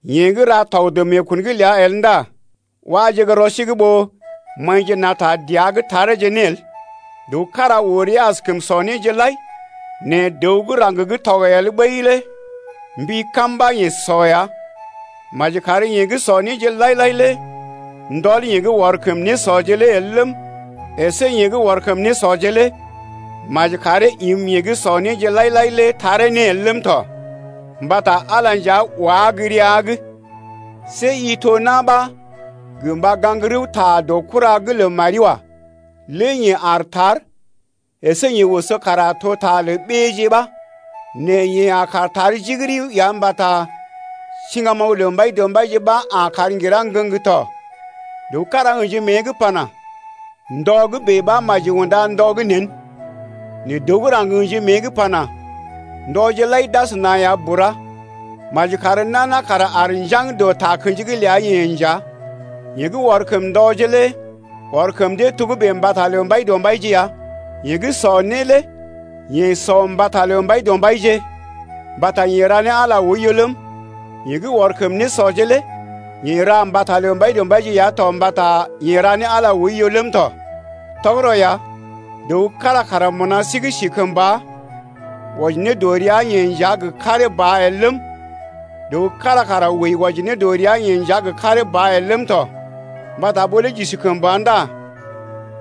Yeḛ gə́ ra tɔg dɔ meekun’g ləa el ndá waje gə́ rɔ sí’g ɓó maḭje na̰ ta dəa’g tareeje ne el. Dəw kára oo rəa askəm sɔ néje lai nɛ dəw gə́ raŋg gə́ tɔg el ɓəi lé mbi kam ɓa yeḛ sɔ ya. Maji kar yeḛ gə́ sɔ néje lai-lai lé ndɔl yeḛ gə́ ɔr kəm nésɔje lé el ləm, əsé yeḛ gə́ ɔr kəm nésɔje lé maji karee im yeḛ gə́ sɔ néje lai-lai el lé taree ne el ləm tɔ, mbata Ala nja wá gə́ rəa’g. See i to na̰ ɓa gə mba gaŋg rəwta dɔ kura’g lə mari wa. Lé yeḛ Aar tar əsé yeḛ oso kara to ta lə ɓéeje ba. Nɛ yeḛ a kaar tar jigiri ya mbata siŋgamoŋ lə Mbaidɔmbaije ɓa a kar ŋgirá ŋgəŋ tɔ. Dəw kára ə̰ji mée’g pana: ndɔ gə́ bèe ɓa maji unda ndɔ gə́ nḛ, nɛ dəw gə́ raŋg ə̰ji mée’g pana: Ndɔje lai d’asəna ya bura. Maji kar nana kara aar njaŋg dɔ takə̰ji’g ləa-yeḛ nja. Yeḛ ɔr kəm ndɔje lé ɔr kəm dee togə́bè mbata lə Mbaidɔmbaije ya. Yeḛ gə́ sɔ né lé yeḛ sɔ mbata lə Mbaidɔmbaije mbata yeḛ ra ne Ala lé oiyo ləm, yeḛ gə́ ɔr kəm nésɔje lé yeḛ ra mbata lə Mbaidɔmbaije ya to mbata yeḛ ra ne Ala oiyo ləm tɔ. Tɔgərɔ ya, dəw kára kara mbuna sí’g si kəmba wɔji ne dɔ rəa-yeḛ nja gə karee ba el ləm, dəw kára kara wəi wɔji ne dɔ rəa-yeḛ nja gə karee ba el ləm tɔ. Mbata ɓó lé j’isi kəmba ndá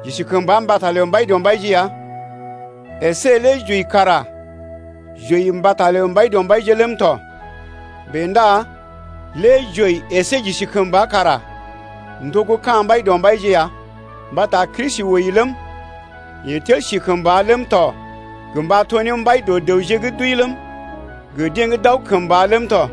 j’isi kəmba mbata lə Mbaidɔmbaije ya, əsé lé j’wəi kara j’wəi mbata lə Mbaidɔmbaije ləm tɔ Bèe ndá lé j’wəi əsé j’isi kəmba kara n’to gə́ ka̰ Mbaidɔmbaije ya. Mbata Kristi wəi ləm, yeḛ tel si kəmba ləm tɔ gə mba to ne mbai dɔ dəwje gə́ d’wəi ləm, gə deḛ gə́ d’aw kəmba ləm tɔ.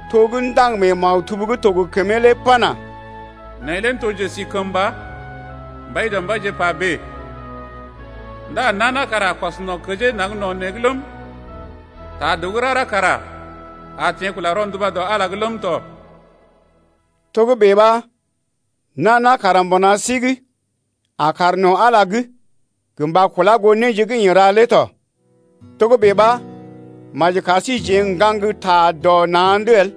To gə́ ndaŋg mee maktub gə́ to gə kəmee lé pana: Neḛ lé n’to njesikəmba, Mbaidɔmbaije pa bèe, Ndá nana kara a kɔs no̰ kəjee naŋg no̰ neḛ’g ləm, Ta dəw gə́ rara kara a teḛ kula rɔnduba dɔ Ala’g ləm tɔ. Togə́bè ɓa nana kara mbuna sí’g a kaar no̰ Ala’g gə mba kula goo néje gə́ yeḛ ra lé tɔ. Togə́bè ɓa maji kar síjeḛ n’gaŋgta dɔ na̰’d el.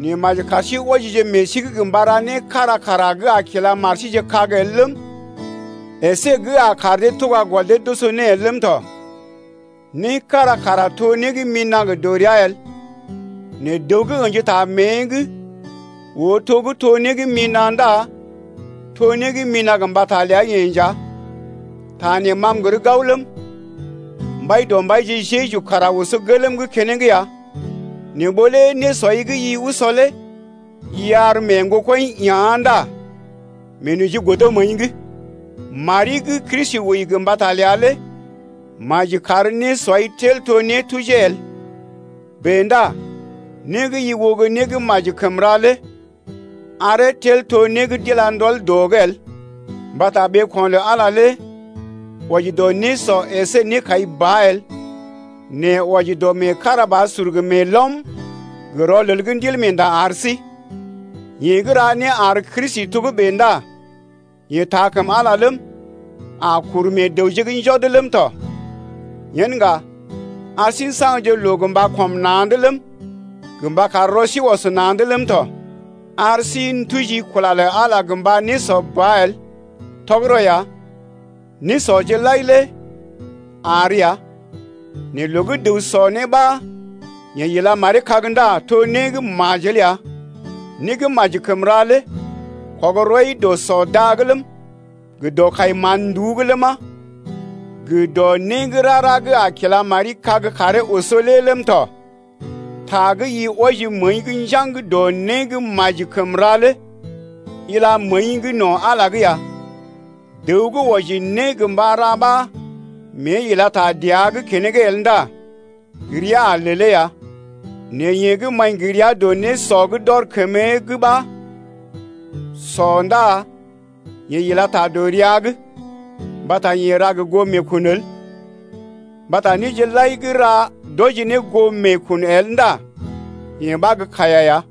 Nɛ maji kar sí wɔjije meḛ sí’g gə mba ra né kára kara gə́ a kila mar síje kag el ləm, əsé gə́ a kar dee tuga gɔl dee koso ne el ləm tɔ. Né kára kara to né gə́ mina̰ gə dɔrea el, nɛ dəw gə́ ə̰ji ta mée’g oo to gə́ to né gə́ mina̰ ndá to né gə́ mina̰ gə mbata ləa-yeḛ nja. Ta neelé ma m’gər gao ləm, Mbaidɔmbaije Jeju kara oso gelm’g keneŋ ya. Nɛ ɓó lé nésɔi gə́ i usɔ lé i ar mee ŋgokɔḭ ea̰ ndá meenoji godo məəi’g. Mari gə́ Kristi wəi gə mbata ləa lé maji kar nésɔi tel to nétujee el. Bèe ndá né gə́ i oo gə́ né gə́ maji kəm ra lé aree tel to né d’ila ne ndɔl dɔ’g el. Mbata ɓeeko̰ lə Ala lé wɔji dɔ nésɔ əsé nékai ba el, nɛ wɔji dɔ meekarabasur gə meelɔm gə rɔlel gə́ Ndilmeenda ar sí. Yeḛ gə́ ra né ar Kristi togə́bè ndá yeḛ taa kəm Ala ləm, a kuru meḛ dəwje’g njɔd ləm tɔ. Yen ŋga ar sí n’saŋgje loo gə mba kɔm na̰’d ləm, gə mba kar rɔ sí ɔs na̰’d ləm tɔ. Ar sí n’tujije kula lə Ala gə mba nésɔ ba el. Tɔgərɔ ya, nésɔje lai lé àr ya, nɛ loo gə́ dəw sɔ né ɓa yeḛ ila maree kag ndá to né gə́ majel ya. Né gə́ maji kəm ra lé, kɔg rɔi dɔ sɔ da’g ləm, gə dɔ kai mán-nduú’g ləma, gə dɔ né gə́ rara gə́ a kila mari kag karee oso lé ləm tɔ. Ta gə́ i wɔji məəi’g njaŋg dɔ né gə́ maji kəm ra lé ila məəi’g no̰ Ala’g ya. Dəw gə́ wɔji né gə mba ra ɓa mée ila ta dəa’g keneŋ el ndá rəa a lelee ya. Nɛ yeḛ gə́ maḭ gə rəa dɔ nésɔ gə́ d’ɔr kəmee’g ɓa sɔ ndá yeḛ ila ta dɔ rəa’g, mbata yeḛ ra gə goo meekun el. Mbata néje lai gə́ ra, d’wɔji ne goo meekun el ndá yee ɓa gə́ kaiya ya.